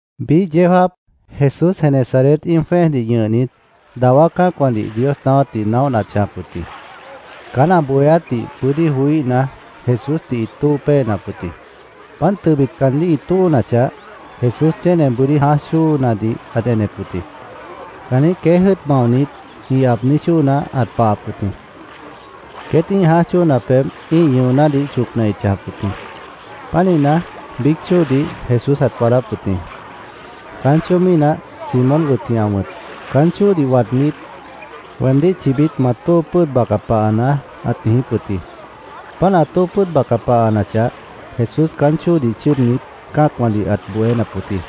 Biíh yeó jáap, Jesús Genesaret íim jwẽ́ejdih ñʉhnit, dawá cã́acwãdih Dios naáwátdih naóhna ãt chãjap wʉt jĩ. Caán ã bohéátdih bʉ́dí joííhna, Jesúsdih ĩt tóo péenap wʉt jĩ. Páant tʉbit caandíh ĩ tóonachah, Jesús chéne bʉ́dí jãáj chóonadih ãt enep wʉt jĩ. Caanjĩ́h queéj jʉ́ʉt maonit ĩ aabní chóona ãt pahap wʉt jĩ. Queét ĩ́ih jãáj chóona pebh ĩ́ih ñʉonádih chocna ĩt chãjap wʉt jĩ. Pánihna, biíc chóodih Jesús ãt waadáp wʉt jĩ. Caán chóo mínah Simón wʉt jĩ ã wʉ̃t. Caán chóodih waadnít, “Weemdíh chibít ma tóo pʉ́ʉd baca pahanaá”, ãt niijíp wʉt jĩ. Páant ã tóo pʉ́ʉd baca pahanachah, Jesús caán chóodih chʉ́ʉdnit, cã́acwãdih ãt bohénap wʉt jĩ.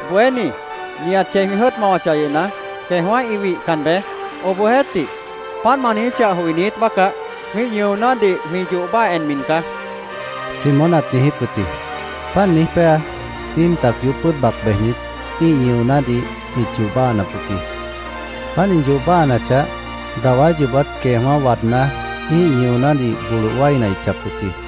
—Bohéní, nihat chei jwĩ jʉ́ʉt mawachah yʉhna, queejwã́ ĩ wihcan beé. Obohjeéhtih, páant ma niijíchah joinít bácah, jwĩ́ih ñʉonádih jwĩ yoh báaha enmi caá, Simón ãt niijíp wʉt jĩ. Páant niíj péa, íim tac yoób pʉ́ʉd bac bejnit, ĩ́ih ñʉonádih ĩt yoh báahanap wʉt jĩ. Páant ĩ yoh báahanachah, dawá yoobát queejwã́ waadná, ĩ́ih ñʉonádih boloh wáina ĩt chãjap wʉt jĩ.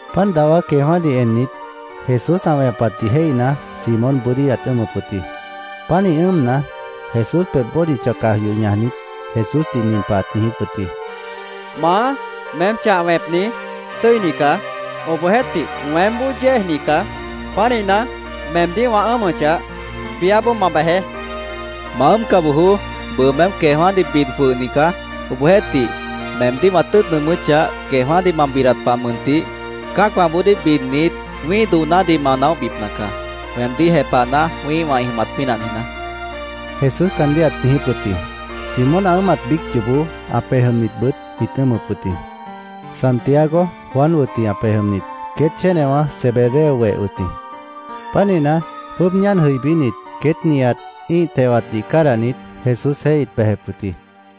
Páant dawá queejwã́dih ennit, Jesús ã wẽpatdih jéihna, Simón bʉ́dí ãt ʉ́ʉmʉp wʉt jĩ. Pánih ʉ́ʉmna, Jesús pebh bódicha caj yoh ñajnit, Jesúsdih nin pah ãt niijíp wʉt jĩ: —Maá, meém chah wẽpni, tʉ́ini caá. Obohjeéhtih, weémboó yéejni caá. Pánihna, meemdíh wã ʉ́ʉmʉchah, biáboó ma bejeé, ãt niijíp wʉt jĩ. —¡Ma ʉ́ʉmca bojoó! Bʉʉ meém queejwã́dih bid jwʉhni caá. Obohjeéhtih, meemdíh wã tʉ́ʉt nʉʉmʉ́chah, queejwã́dih ma bidat pah mʉntih, cã́acwãboodíh bidnit, wĩ́ih doonádih ma naóhbipna caá, weemdíh jepahna, wĩ́ihwã ĩ jʉmat pínah niijná, Jesús caandíh ãt niijíp wʉt jĩ. Simón ã ʉ́ʉmat biíc yoobó ã pej jʉmnitbʉt ĩt ʉ́ʉmʉp wʉt jĩ. Santiago, Juan wʉt jĩ ã pej jʉmnit. Queét chénewã Zebedeo weh wʉt jĩ. Pánihna, jwʉ́ʉb ñáan jʉibínit, queét nihat ĩ́ih tewatdih cádahnit, Jesúsjeéh ĩt bejep wʉt jĩ.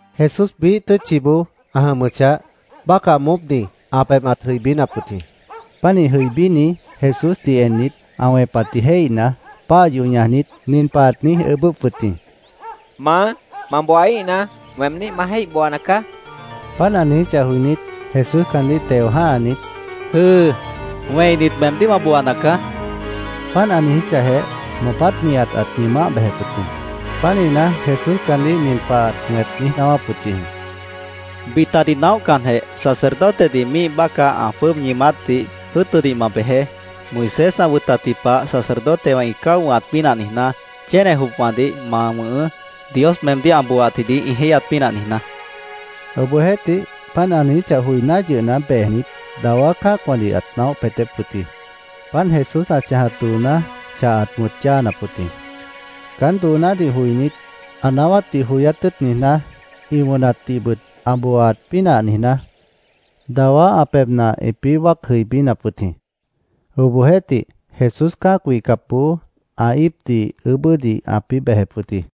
Jesús biíh tʉ́tchiboó ã jʉmʉchah, bácah moópni ã pebh ãt jʉibínap wʉt jĩ. Pánih jʉibíni Jesúsdih ennit, ã wẽpatdih jéihna, páah yoh ñajnit, nin pah ãt niíj ʉʉ́bʉ́p wʉt jĩ: —Maá, ma booaíhna, weemdíh ma jéih booana caá, ãt niijíp wʉt jĩ. Páant ã niijíchah joinít, Jesús caandíh teo jã́hanit, —¡Jʉ́ʉ! Wẽinit, meemdíh wã booana caá, ãt niijíp wʉt jĩ. Páant ã niijíchahjeh, moopát nihat ãt ñʉʉmáh bejep wʉt jĩ. Pánihna, Jesús caandíh nin pah ãt wẽp niíj naáwáp wʉt yʉh jĩ: —Bitadih naóhcanjeh, sacerdotedih míih bácah ã jwʉ́ʉb ñʉʉmátdih jʉ́ʉtʉdih ma bejeé. Moisés ã wʉtatji pah sacerdotewã ĩ cáo wʉ̃hat pínah niijná, chéne jopwãdih ma wʉ̃hʉʉ́, Dios meemdíh ã booaatjidih ĩ jéihyat pínah niijná, ãt niijíp wʉt jĩ. Obohjeéhtih, páant ã niijíchah joiná yʉhna, bejnit, dawá cã́acwãdih ãt naóh peetép wʉt jĩ. Páant Jesús ã chãjat dooná chah ãt wʉ̃t yáanap wʉt jĩ. Caán doonádih joinít, ã naáwátdih joyát tʉ́ʉt niijná, ĩ wʉnatdihbʉt ã booaat pínah niijná, dawá ã pebhna ĩpĩ́ wáac jʉibínap wʉt jĩ. Obohjeéhtih, Jesús cã́ac wihcapboó, ã íipdih ʉʉ́bʉ́dih ãpĩ́ bejep wʉt jĩ.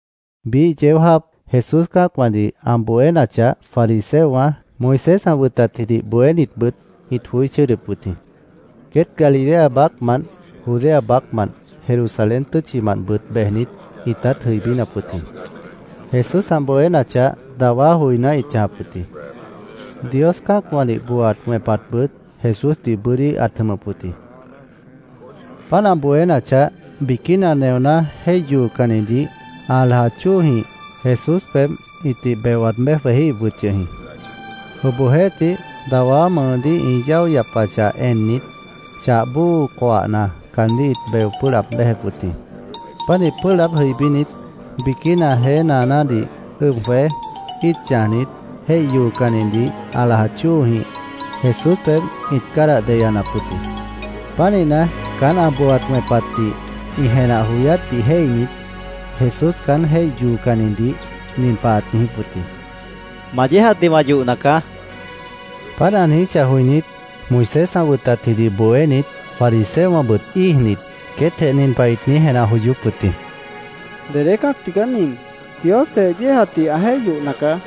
Biíh yeó jáap Jesús cã́acwãdih ã bohénachah, fariseowã, Moisés ã wʉtatjidih bohénitbʉt ĩt joí chʉ́ʉdʉp wʉt jĩ. Queét Galilea baácmant, Judea baácmant, Jerusalén tʉ́tchimantbʉt bejnit, ĩtát jʉibínap wʉt jĩ. Jesús ã bohénachah, dawá joiná ĩt chãjap wʉt jĩ. Dios cã́acwãdih booaat wẽpatbʉt Jesúsdih bʉ́dí ãt jʉmʉp wʉt jĩ. Páant ã bohénachah, biquína neoná jéih yoocannidih ã lajat chóojĩh Jesús pebh ĩtih beo waad béj jwejíhip wʉt yʉh jĩ. Obohjeéhtih, dawá mʉʉdíh ĩ yáo yapachah ennit, chah bóo coahna caandíh ĩt beo pʉ́ʉh laab béjep wʉt jĩ. Pánih pʉ́ʉh laáb jʉibínit, biquína jeé naanádih ʉb jwej, íit chãjnit, jéih yoocannidih ã lajat chóojĩh Jesús pebh ĩt cádah deyanap wʉt jĩ. Pánihna, caán ã booaat wẽpatdih ĩ jenah joyátdih jéihnit, Jesús caán jéih yoocannidih nin pah ãt niijíp wʉt jĩ: —Ma yéejatdih wã yohna caá, ãt niijíp wʉt jĩ. Páant ã niijíchah joinít, Moisés ã wʉtatjidih bohénit, fariseowãbʉt íijnit, queétjeh nin pah ĩt niíj jenah joyóp wʉt jĩ: “¿Dedé cã́ac tigaá nin? Diosjeh yéejatdih ã jéih yohna caá.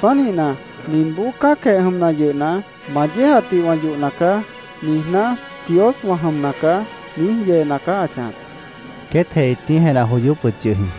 Pánihna, ninboó cã́acjeh jʉmna yʉhna, ‘Ma yéejatdih wã yohna caá’, niijná, ‘Dios wã jʉmna caá’, niíj yeena caá ã chãjap”, queétjeh ĩt niíj jenah joyóp wʉt yʉh jĩ.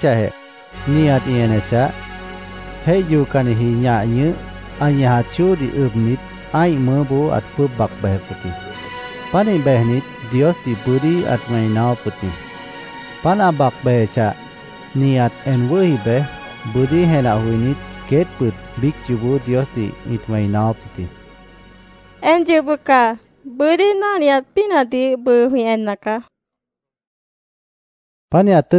Páant ã niijíchahjeh, nihat ĩ enechah, jéih yoocanniji ñah ñʉh, ã ñajat chóodih ʉbnit, ã́ih mʉʉ́boó ãt jwʉ́ʉb bac bejep wʉt jĩ. Pánih bejnit, Diosdih bʉ́dí ãt wẽi naáwáp wʉt jĩ. Páant ã bac bejechah, nihat en wʉ́hi bej, bʉ́dí jenah joinít, queétbʉt biíc yoobó Diosdih ĩt wẽi naáwáp wʉt jĩ. —¡En yʉh bʉca! Bʉ́dí náhniat pínahdih bʉʉ jwĩ enna caá, ĩt míic niijíp wʉt jĩ.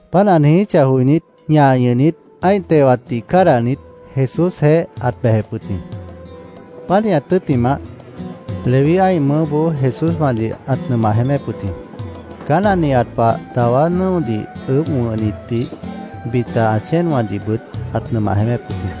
Páant ã niijíchah joinít, ñah ñʉh, ã́ih tewatdih cádahnit, Jesúsjeéh ãt bejep wʉt jĩ. Pánihat tʉ́ttimah, Leví ã́ih mʉʉ́boó Jesúswãdih ãt nʉmah jeémép wʉt jĩ. Caán ã nihat pah dawá nʉ́odih ʉʉ́bh wʉ̃hnitdih, bita ã chéenwãdihbʉt ãt nʉmah jeémép wʉt jĩ.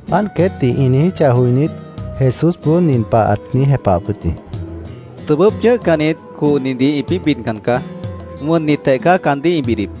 Páant queétdih ĩ niijíchah joinít, Jesúsboó nin pah ãt niíj jepahap wʉt jĩ: —Tʉbʉ́p chʉ̃ʉ́hcannit cohnidih ĩpĩ́ bidcan caá. Wʉnnitjeh caá caandíh ĩ bidip.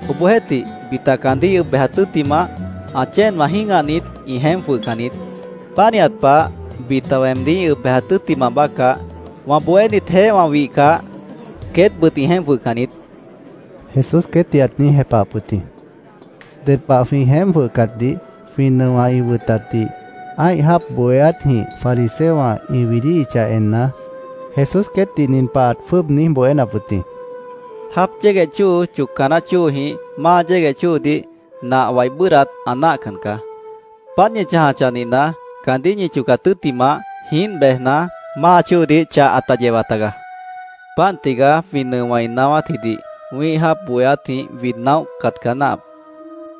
Obohjeéhtih, bita caandíh ĩ ʉb bejat tʉ́ttimah, ã chéenwã jĩ́gahnit, ĩ jeémp jwʉhcan niít. Pánihat pah bita weemdíh ĩ ʉb bejat tʉ́ttimah bácah, wã bohénitjeéh wã wihcah, queétbʉt ĩ jeémp jwʉhcan niít, Jesús queétdih ãt niíj jepahap wʉt jĩ. Ded pah jwĩ jeémp jwʉhcatdih jwĩ nʉowã ĩ wʉtatdih, ã́ih jáap bohéátjĩh fariseowã ĩ widíhichah enna, Jesús queétdih nin pah ãt jwʉ́ʉb niíj bohénap wʉt jĩ: —Jáap yégueh chóo chocca naáh chóojĩh máa yégueh chóodih nah wai bʉ́ʉdhdat ã náahcan caá. Páant ñi chãjachah nihna, caandíh ñi chocat tʉ́ttimah, jiínt bejna, máa chóodih chah ãta yewa tagaá. Páant tigaá, jwĩ nʉowã ĩ naáwátjidih, wĩ́ih jáap bohéátjĩh wid naóhcat caá náahap.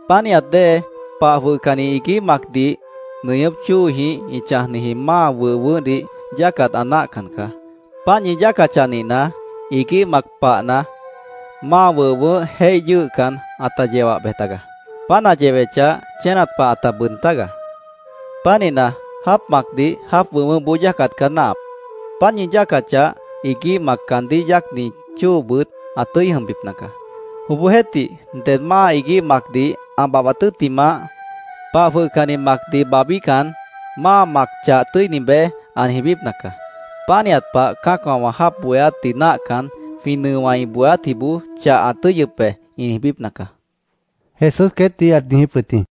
Pánihat dée, pah jwʉhcanni iguíh macdih nʉñʉ́p chóojĩh ĩ chãjniji máa wʉh wʉʉ́hdih yáacat ã náahcan caá. Páant ñi yáacachah nihna, iguíh mac pahna, máa wʉh wʉʉ́h jéih yʉ́ʉhcan, ãta yewah bej tagaá. Páant ã yewechah, chénat pah ãta bʉʉd tágaá. Pánihna, jáap macdih, jáap wʉh wʉʉ́hboó yáacat caá náahap. Páant ñi yáacachah, iguíh mac, caandíh yáacni chóobʉt ã tʉ́i jʉmbipna caá. Obohjeéhtih, ded máa iguíh macdih ã babhbat tʉ́ttimah, pah jwʉhcanni macdih babhbíhcan, ‘Máa mac chah tʉ́ini beé’, ã niijbípna caá. Pánihat pah cã́acwã wã jáap bohéátdih náahcan, ‘Jwĩ nʉowã ĩ bohéátjiboó chah ã tʉ́yʉp be’, ĩ niijbípna caá, Jesús queétdih ãt niijíp wʉt jĩ.